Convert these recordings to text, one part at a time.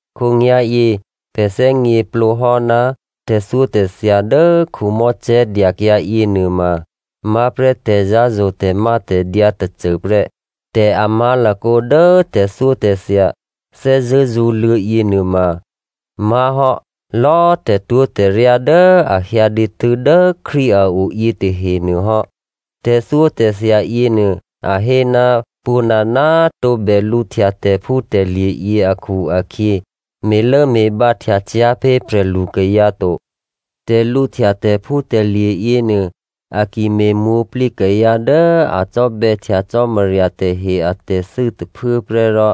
Khǒnyá̤yě pè̤ thè́gněplǒ hò́ ná tè̤thyótè̤thya dố Mosè dyakyǎ yěnuôma má̤prè́ tè̤zǎ̤zo̤ tè̤mátè̤dyǎ tôcôprè́. Tè̤amá̤lakǒ dố tè̤thyótè̤thya thè́zṳ̂́ zṳ̌luô̌ yěnuôma má̤hò́ lò̌꤮ tè̤twó̤tè̤ryá dố a hyǎ dǐtû́ dố Krístu a o yětahenuô hò́. Tè̤thyótè̤thya yěnuô a hé, pwǒ̤nana꤮ tǒbè lǔhtya tè̤phútè̤lye̤ yě akhu-akhyě, me̤lốme̤bǎhtya cyá̤ pé̤ prè̤lu kayǎ to. Tè̤lǔhtya tè̤phútè̤lye̤ yěnuô, a ki me̤mwǒ̤plǐ kayǎ dố a cò́bè̌htya Cò́marya tahe atè̤thû́ tôphuố prè́ rò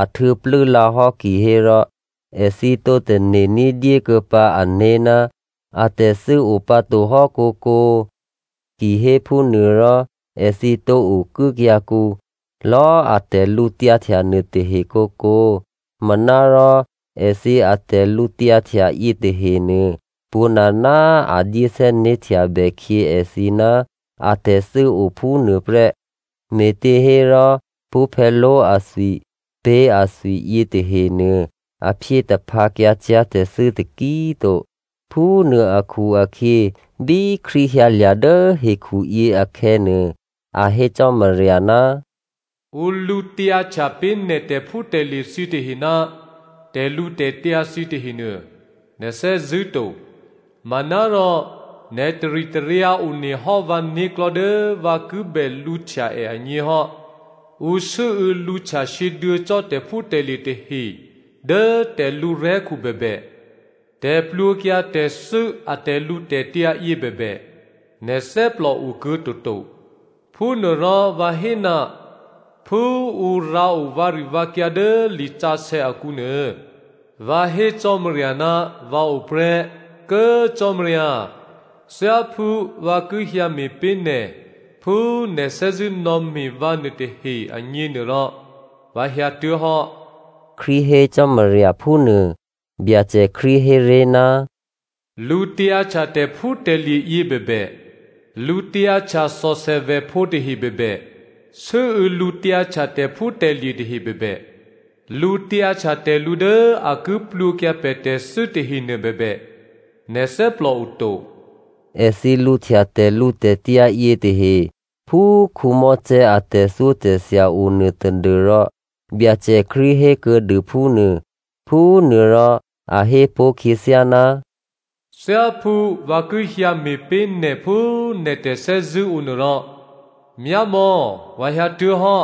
a htuô̌plû́ lǎhò́ kihérò, èthǐ tǒ tane̤ ní̤dyé kuô̌ pǎ ané̤ ná atè̤thû́ o pǎ to hò́ kǒkǒ. Kihéphúnuô rò èthǐ tǒ okuốkyǎkǔ lò̌ a tè̤lǔtyǎhtya nuôtahe kǒkǒ. Manárò èthǐ atè̤lǔtyǎhtya yětahenuô, pwǒ̤nana꤮ a dyé thè́né̤htyabè khyě èthǐ ná a tè̤thû́o phúnuô prè́. Me̤těhérò pṳ́phè̌ló̤ athwi, pé̤ athwi yětahenuô a phyé taphǎkyǎ cyá̤ tè̤thû́ taki꤮ to. Phúnuô akhu-akhyě bí Krístu hyǎlya̤ dố hekhuyě akhè̌nuô, a hé Cò́marya, “Ǔ lǔtyǎhtya pé̤ nè̤ tè̤phútè̤lye̤ thǐtahe ná tè̤lǔtè̤tyǎ thǐ tahenuô, nè̤ thè́zṳ̂́ to. Manárò nè̤ taritaryǎ onehò́ vǎ né̤klò̤́ dố vǎ ki bè lǔhtya è agněhò́. Ǔ sû́û̌ lǔhtya sǐduô̌ cò́ tè̤phútè̤lye̤ tahe dố tè̤lǔ rè̤́khu bèbè, tè̤plwǒkyǎ tè̤thû́ a tè̤lǔtè̤tyǎ yě bèbè, nè̤ thè́plò okuô̌toto. Phúnuôrò, vǎ hé, ‘Phú ǔ rǎo vǎrivǎkyǎ dố lisǎsè̌ akǔnuô, vǎ hé Cò́marya, vǎ o prè́, Kố꤮ Cò́marya, thyáphú vǎ ki hyǎ me̤ pé̤ nè̤ phú nè̤ thè́zṳ̂́ nò̌me̤ vǎ nuôtahe agněnuôrò, vǎ hyǎtuố̤hò́,’” Krístu hé Cò́marya phúnuô. Byacè Krístu héré̤, “Lǔtyǎhtya tè̤phútè̤lye̤ yě bèbè, lǔtyǎhtya thòthè vèphǒ tahe bèbè, sû́û̌ lǔtyǎhtya tè̤phútè̤lye̤ tahe bèbè, lǔtyǎhtya tè̤lǔ dố a ki plwǒkyǎ pè̤ tè̤thû́ tahenuô bèbè nè̤ thè́plòoto,” (Èthǐ lǔhtya tè̤lǔtè̤tyǎ yětahe phú Mosè a tè̤thyótè̤thya onuô tadû́rò Byacè Krístu hé kuô̌dû phúnuô.) Phúnuôrò a hé pó̤ khyěthyá, “Thyáphú vǎ ki hyǎ me̤pé̤ nè̤ phú nè̤ tè̤thè́zṳ̂́ o nuôrò, myámò̌꤮ vǎ hyǎtuố̤hò́,”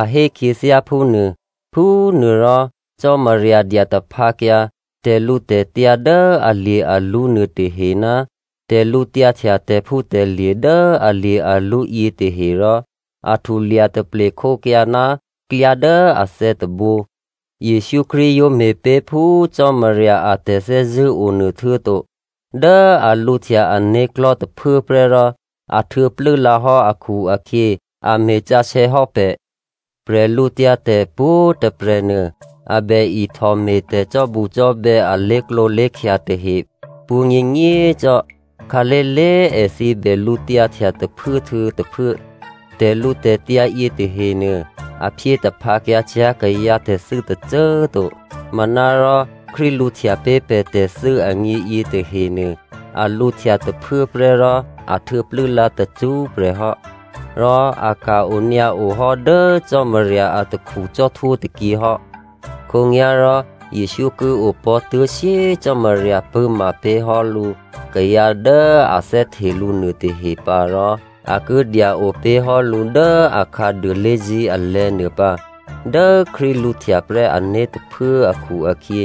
a hé khyěthyá phúnuô. Phúnuôrò Cò́marya dya taphǎkyǎ tè̤lǔtè̤tyǎ dố alye̤-alwǒ nuôtahe ná tè̤lǔtyǎhtya tè̤phútè̤lye̤ dố alye̤-alwǒ yětahe rò a htulya taplekhókyǎ ná klyá dố athè̌ tôbǒ. Jesǔ Krístu yǒ me̤pé̤ phú Cò́marya a tè̤thè́zṳ̂́ onuô, htuô̌to dố a lǔhtya ané̤klò̤́ tôphuốprè́ rò a htuô̌plû́ lǎhò́ akhu-akhyě, a me̤ sǎsè̌ hò́ pè̤. Bwídu pwǒ̤꤮ tôprè̤ nuô, a bè ihtò me̤ tè̤cò́bucò́bè̌ a lé̤klǒlé̤khya tahe pwǒ̤nyěnyě꤮ cò́. Khǎlé̤lé̤꤮ èthǐ bè lǔtyǎhtya tôphuốhtuô̌ tôphuố. Tè̤lǔtè̤tyǎ yětahenuô a phyé taphǎkyǎ cyá̤ kayǎ tè̤thû́ tôcô꤮ to. Manárò Krístu lǔhtya pé̤ pè̤ tè̤thû́ agně yětahenuô, a lǔhtya tôphuốprè́ rò a htuô̌ plû́lǎ tacṳ́prè̤ hò́. Rò a ka̤ onyǎo hò́ dố Cò́marya atakhu cò́htwó tôkyě hò́. Khǒnyá̤rò Jesǔ ki opò̤́ tuố̤ shyé꤮ Cò́marya pṳ̂́ma pé̤ hò́ lǔ kayǎ dố a thè́hte lǔ nuôtahe pǎ, rò a ki dya-o pé̤hò́ lǔ dố akhǎduô lé̤zí̤ alè̤̌ nuô pǎ. Dố Krístu lǔhtya prè́ ané̤ tôphuố akhu-akhyě,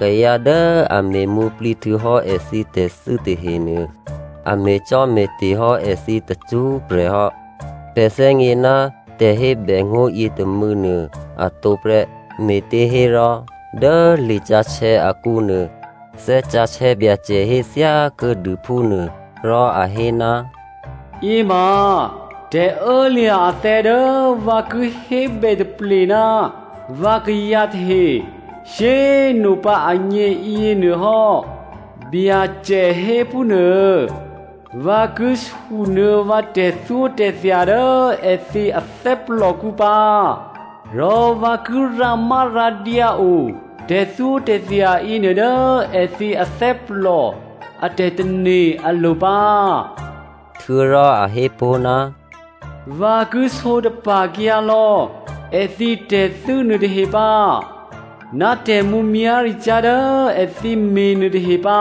kayǎ dố è me̤mwǒ̤plǐ htuô̌hò́ èthǐ tè̤thû́ tahenuô, a me̤cò́me̤te̤ hò́ èthǐ tacṳ́prè̤ hò́. Pè̤ thè́gně ná tè̤hébè ngó̤ yětômû̌nuô atǒ prè́. Me̤těhérò, dố lisǎsè̌ akǔnuô, Thè́ Sǎsè̌ Byacè hé thyákuô̌dû phúnuô, rò a hé, “Yěma tè̤ô̌lya̤ athè̌ dố vǎ ki hébè taple ná vǎkayǎ tahe shyé꤮ nopǎ agně yěnuô hò́, Byacè hé phúnuô. Vǎ ki sunuô̌ vǎ tè̤thyótè̤thya dố èthǐ athè́plòkǔ pǎ, rò vǎ ki rǎmárǎdyǎ o tè̤thyótè̤thya yěnuô dố èthǐ athè́plò a tè̤tane̤ alo̤ pǎ.” Htuô̌rò a hé pó̤, “Vǎ ki sǒtapa̤kyǎ lò̌ èthǐ tè̤thû́ nuôtahe pǎ, ná tè̤mǔmyá̤ricyá̤ dố èthǐ me̤ nuôtahe pǎ.”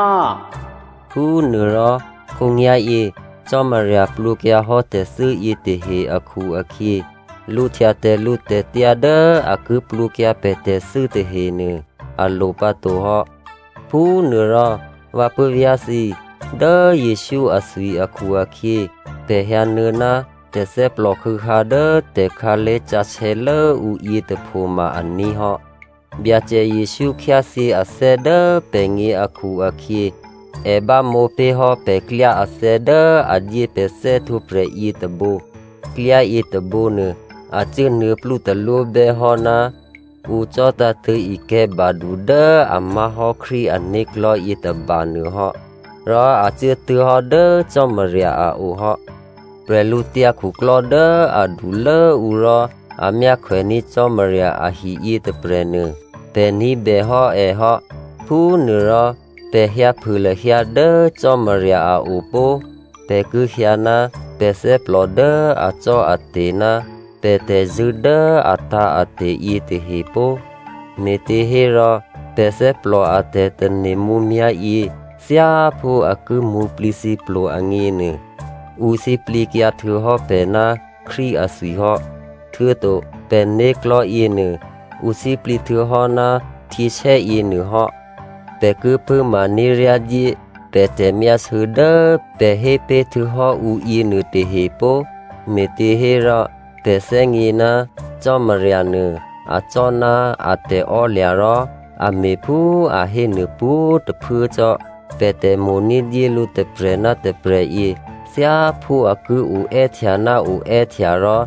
Phúnuôrò khǒnyá̤yě Cò́marya plwǒkyǎhò́ tè̤thû́ yětahe akhu-akhyě, lǔhtya tè̤lǔtè̤tyǎ dố a ki plwǒkyǎ pè̤ tè̤thû́ tahenuô a lo pǎtohò́. Phúnuôrò, vǎ puố̤vyá̤ thǐ꤮. Dố Jesǔ athwi akhu-akhyě, pè̤ hyǎnuô̌ ná tè̤thè́plò khû̌hǎ dố tè̤khǎlé̤ sǎsè̌ lốǔ yětôpho ma aní̤ hò́. Byacè Jesǔ khyáthyě athè́ dố pè̤gně akhu-akhyě, è bámǒ pé̤ hò́ pè̤klyá athè̌ dố a dyé pè̤ thè́htwǒprè̤ yětôbǒ. Klyá yětôbǒnuô, a cuốnuô̌plú talwó bè́hò́ ná ǔ cò̤́tǎ̤tṳ̂̌ ikè̤̌ badu dố a má̤hò́ Krístu ané̤klò̤́ yětôbanuô hò́ rò a cuốtuố̤hò́ dố Cò́marya a o hò́. Prè̤lǔtyǎ khuklò́ dố adulốǔ rò a myákhwèní̤ Cò́marya ahi yětôprè̤nuô, pè̤ ní̤bèhò́ è hò́. Phúnuôrò pè̤ hyǎphû lahyǎ dố Cò́marya a o pó꤮. Pè̤ ki hyǎ ná pè̤ thè́plò dố acò́ate̤, ná pè̤ tè̤zṳ̂́ dố atǎ̤ate̤ yětahe pó꤮. Me̤těhérò, pè̤ thè́plò a tè̤tane̤ mǔmyá̤yě, thyáphú a ki mwǒ̤plǐthǐplo agněnuô, ǔ sǐplǐkyǎ htuô̌hò́ pè̤ ná Krístu athwi hò́. Htuô̌to pè̤né̤klò̤́ yěnuô, ǔ sǐplǐ htuô̌hò́ ná htyěsè́ yěnuôhò́. Pè̤ ki pṳ̂́ma ní̤ryádyé pè̤ tè̤myásû̌ dố pè̤ hé pé̤ htuô̌hò́ ǔ yěnuôtahe pó꤮, me̤těhérò pè̤ thè́gně ná Cò́marya nuô acò́ ná a tè̤ò́lya̤ rò a me̤phú a hénuô pwǒ̤꤮ tôphuố cò́. Pè̤ tè̤mo̤ ní̤dyé lǔ tôprè̤ ná tôprè̤ yě, thyáphú a ki o è́htya ná o è́htya rò,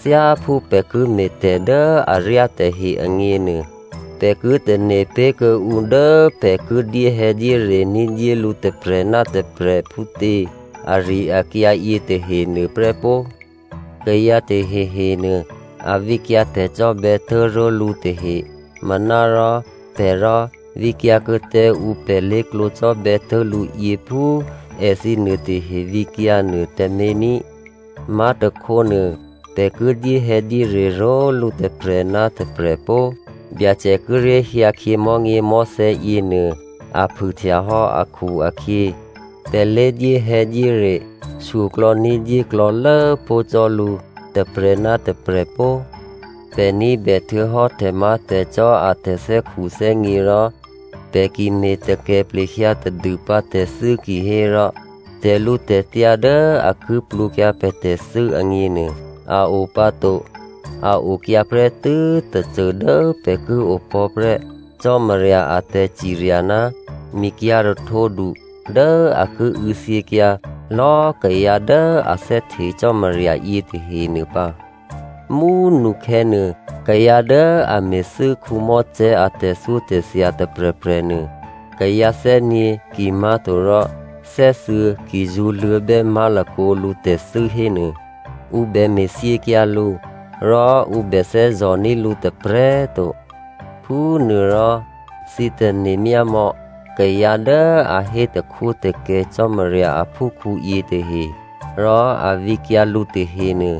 thyáphú pè̤ ki me̤tè̤ dố aryá tahe agněnuô, pè̤ ki tane̤ pé̤kuô̌ ǔ dố pè̤ ki dyéhè̌dyére ní̤dyé lǔ tôprè̤ ná tôprè̤ phútě ari-akyǎ yětahenuô prè́ pó꤮. Kayǎ tahehe nuô, a vǐkyǎ tè̤cò́bè̌ tố̤ró̤lǔ tahe, manárò pè̤ rò, vǐkyǎ kuô̌ tǎ ǔ pè̤ lé̤klǒ cò́bè̌ tố̤lǔyě phú èthǐ nuôtahe vǐkyǎ nuô tǎmé̤ ní꤮. Má̤tôkhónuô, pè̤ ki dyéhè̌dyére ró̤lǔ tôprè̤ ná tôprè̤ pó꤮. Byacè kíré̤ hyǎkhyě mò̤́nyěmò̤́thè̌ yěnuô a phûhtyahò́ akhu-akhyě, pè̤ lé dyéhè̌dyére shyoklò̌ ní̤dyé klò̌lố pó̤ cò́ lǔ tôprè̤ ná tôprè̤ pó꤮. Pè̤ ní̤bè htuô̌hò́ tè̤má̤tè̤cò́ a tè̤thè́khuthè́gně rò pè̤ ki me̤ takè plehyǎ tadûpǎ tè̤thû́ kihérò tè̤lǔtè̤tyǎ dố a ki plwǒkyǎ pè̤ tè̤thû́ agněnuô a o pǎ to. A okyǎ prè́tû́ tôcô dố pè̤ ki opò̤́prè́ Cò́marya a tè̤cirya ná mikyǎ̤ rahtǒdu dố a ki û̌thyěkyǎ lò̌꤮ kayǎ dố a thè́hte Cò́marya yětahenuô pǎ. Mú꤮ nukhè̌nuô kayǎ dố a me̤thû́ Mosè a tè̤thyótè̤thya tôprè̤prè̤ nuô, kayǎ thè́gně kimá̤torò thè́thuô̌ ki zṳ̌luô̌bè́ má̤lakǒ lǔ tè̤thû́ hénuô, ǔ bè me̤ thyěkyǎ lǔ, rò ǔ bè thè́zò̤ ní̤ lǔ tôprè̤꤮ to. Phúnuôrò thǐ tane̤ myámò̌ kayǎ dố a hé takhwótakè Cò́marya aphúkhǔ yětahe, rò a vǐkyǎ lǔ tahenuô,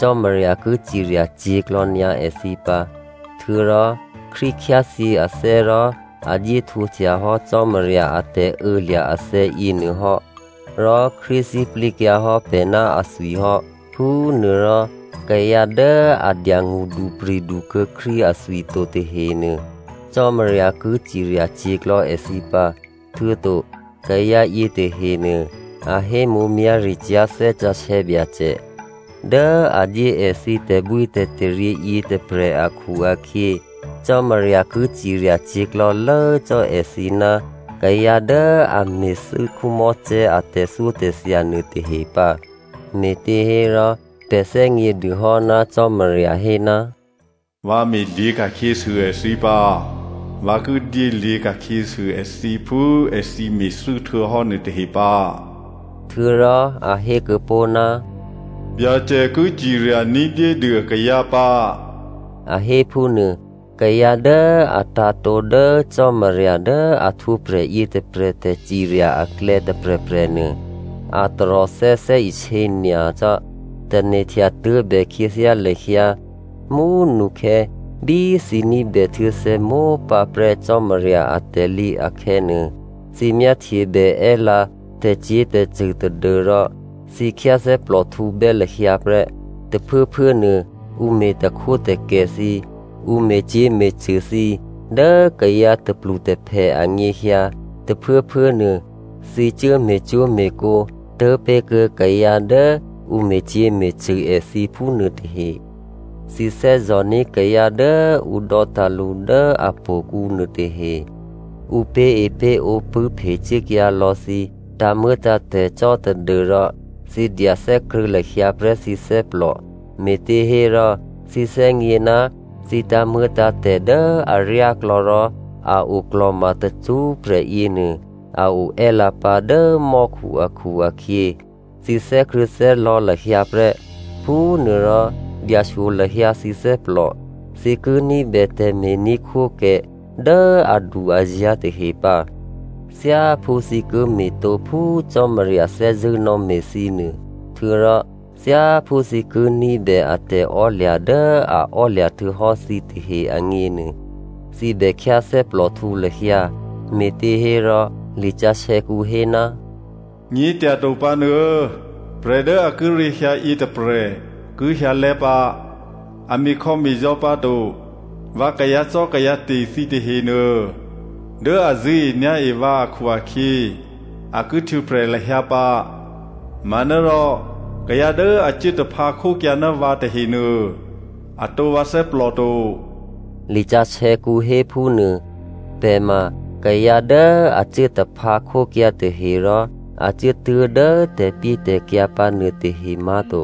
Cò́marya ki cirya cyě̤klò̌nyǎ èthǐ pǎ. Htuô̌rò Krístu khyáthyě athè́ rò a dyé htwǒhtya hò́ Cò́marya a tè̤ô̌lya̤ athè̌ yěnuôhò́ rò Krístu sǐplǐkyǎ hò́ pè̤ ná athwi hò́. Phúnuôrò kayǎ dố a dya ngṳdupri̤du kuô̌ Krístu athwi to tahenuô, Cò́marya ki cirya cyě̤klò̌ èthǐ pǎ. Htuô̌to kayǎ yětahenuô a hé mǔmyá̤ricyá̤ Thè́ Sǎsè̌ Byacè dố a dyé èthǐ tè̤bwítè̤taryě yětôprè̤ akhu-akhyě, Cò́marya ki ciryacyě̤ klò̌lố cò́ èthǐ ná kayǎ dố a me̤thû́ Mosè a tè̤thyótè̤thya nuôtahe pǎ. Me̤těhérò, pè̤ thè́gnědû hò́ ná Cò́marya hé, “Vǎ me̤lyě̤ ka̤khyěsû èthǐ pǎ. Vǎ ki dyélyě̤ ka̤khyěsû èthǐ phú èthǐ me̤thû́ htuô̌hò́ nuôtahe pǎ,” htuô̌rò a hé kuô̌ pó̤, “Byacè ki cirya ní̤dyédû akayǎ pǎ,” a hé phúnuô. Kayǎ dố a tǎ̤tǒ dố Cò́marya dố a htwǒprè̤ yětôprè̤ tè̤cirya aklè̌ tôprè̤prè̤nuô, a taròthè́ thè́isě nyacò́. Tane̤htya tuố̤bè khyěthyá lahyǎ mú꤮ nukhè̌ bí thǐ ní̤bè htuô̌thè̌mópǎ prè́ Cò́marya atè̤lǐ akhè̌nuô, thǐ myáhtyebè è́lǎ tè̤cyě̤tè̤cṳ̂ tadû́rò thǐ khyáthè́plòhtǔbè́ lahyǎ prè́. Tôphuốphuố nuô ǔ me̤ takhwótakè thǐ, ǔ me̤cyě̤me̤cṳ̂ thǐ dố kayǎ tôplutôphè anyěhyǎ, tôphuốphuốnuô thǐ cuố me̤cwó̤me̤kǒ tố̤pé̤kuô̌ kayǎ dố ǔ me̤cyě̤me̤cṳ̂ èthǐ phúnuô tahe. Thǐ thè́zò̤ní̤ kayǎ dố ǔ dò́tǎ̤ lǔ dố htò̌kǔ nuôtahe. Ǔ pé̤epé̤ǒ pṳ̂́phe cuốkyǎ lò̌ thǐ tǎ̤muô̌tǎ̤tè̤ cò́ tadû́rò, thǐ dya thè́krṳ̂̌ lahyǎ prè́ thǐ thè́plò, me̤těhérò thǐ thè́gně ná thǐ tǎ̤muô̌tǎ̤tè̤ dố aryáklò̌ rò a oklò̤ma tacṳ́prè̤ yěnuô a o è́lǎpǎ dố mò́khu akhu-akhyě, thǐ thè́krṳ̂̌thè́lò̌ lahyǎ prè́, Phúnuôrò dyashyo lahyǎ thǐ thè́plò. Thǐ ki ní̤bè tè̤me̤ní̤khwókè dố adu-azǎ̤ tahe pǎ. Thyáphú thǐ ki me̤tǒ phú Cò́marya thè́zṳ̂́ nò̌me̤ thǐ nuô, htuô̌rò thyáphú thǐ ki ní̤bè a tè̤ò́lya̤ dố a ò́lya̤ htuô̌hò́ thǐ tahe agněnuô, thǐ bèkhyáthè́plòhtǔ lahyǎ. Me̤těhérò, lisǎsè̌kǔ hé, “Nyě̤tyato pǎnuô, prè̤ dố a kíré̤ hyǎyě tôprè̤ ki hyǎlè́ pǎ, a me̤khò̌me̤zò̌ pǎto. Vǎ kayǎcò́kayǎte̤ thǐ tahenuô, dố a zṳ̂́enyá̤e vǎ akhu-akhyě, a ki htwǒprè̤ lahyǎ pǎ. Manárò kayǎ dố a cuố taphǎkhókyǎ ná vǎ tahenuô, atǒ vǎ thè́plò to,” lisǎsè̌kǔ hé phúnuô. Pè̤ ma kayǎ dố a cuố taphǎ khókyǎ tahe, rò a cuốtuố̤ dố tè̤pyétè̤kyǎ pǎ nuôtahe má̤to.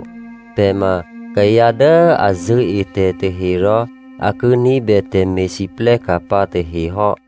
Pè̤ ma kayǎ dố a zṳ̂́e tè̤ tahe rò a ki ní̤bè tè̤me̤lwóhteka̤ pǎ tahe hò́.